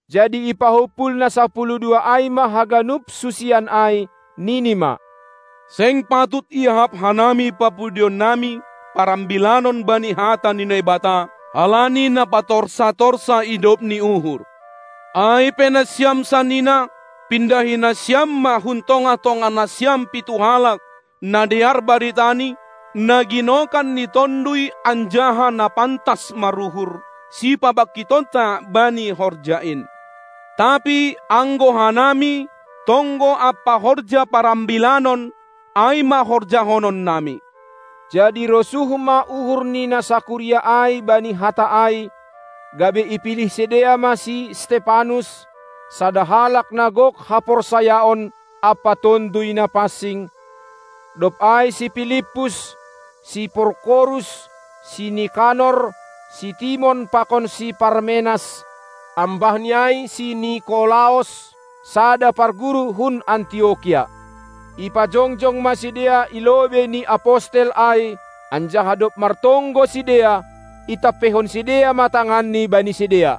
Jadi ipahumpul na sapuluh dua ai ma haganup susian ai, nini ma: Seng patut iahap hanami papudionnami parambilanon bani hata ni Naibata, halani na patorsa-torsa idop ni uhur. Ai pe nasiam sanina, pindahi nasiam ma hun tongah-tongah nasiam pitu halak, na dear baritani, na ginokan ni Tonduy anjaha na pantas maruhur, sipabangkitonta bani horja in. Tapi, anggo hanami, tonggo ampa horja parambilannon ai ma horjahononnami. Jadi rosuh ma uhur ni na sakuria ai bani hata ai, gabe ipilih sidea ma si Stepanus, sada halak na gok haporsayaon ampa Tonduy Na pansing, dob ai si Pilippus, si Porkorus, si Nikanor, si Timon pakon si Parmenas, ambah ni ai si Nikolaos, sada parguru hun Antiokia. Ipajongjong ma sidea i lobei ni apostel ai, anjaha dob martonggo sidea, itampeihon sidea ma tanganni bani sidea.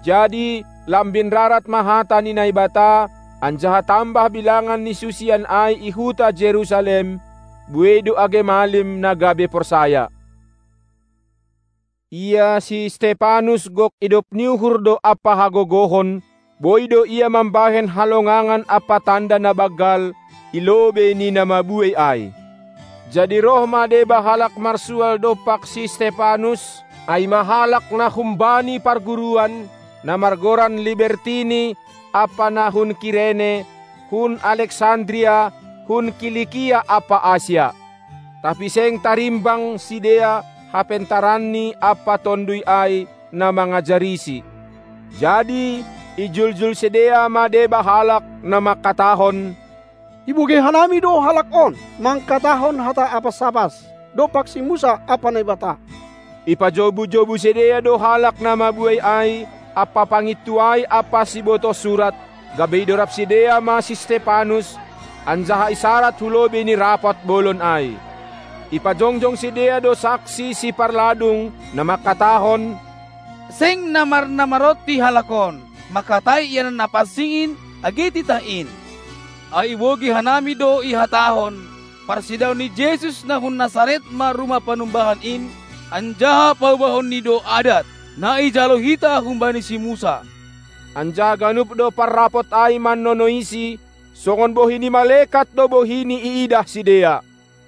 Jadi lambin rarat ma hata ni Naibata, anjaha tambah bilangan ni susian ai i huta Jerusalem; buei do age malim, na gabe porsaya. Ia si Stepanus gok idop ni uhur do ampa hagogohon; boi do ia mambahen halongangan ampa tanda na banggal i lobei ni na mabuei ai. Jadi roh ma deba halak marsual dompak si Stepanus, ai ma halak na humbani parguruan, na margoran Libertini, ampa na hun Kirene, hun Alexandria, hun Kilikia ampa Asia. Tapi seng tarimbang sidea hapentaranni ampa Tonduy ai, na mangajarisi. Jadi ijuljul sidea ma deba halak, na mangkatahon: Ibogei hanami do halak on mangkatahon hata apas-apas dompak si Musa ampa Naibata. Ipajobu-jobu sidea do halak na mabuei ai ampa pangintuai ampa sibotoh surat, gabe idorab sidea ma si Stepanus, anjaha isarad hu lobei ni Rapot Bolon ai. Ipajongjong sidea do saksi siparladung, na mangkatahon: Seng na marnamaronti halak on mangkatai ianan na pansing in age titah in, ai ibogei hanami do ihatahon: Parsedaon ni Jesus na hun Nasaret ma rumah panumbahan in, anjaha paubahonni do adat, na ijalo hita humbani si Musa. Anjaha ganup do parrapot ai mannonoisi; songon bohi ni malekat do bohini iidah sidea.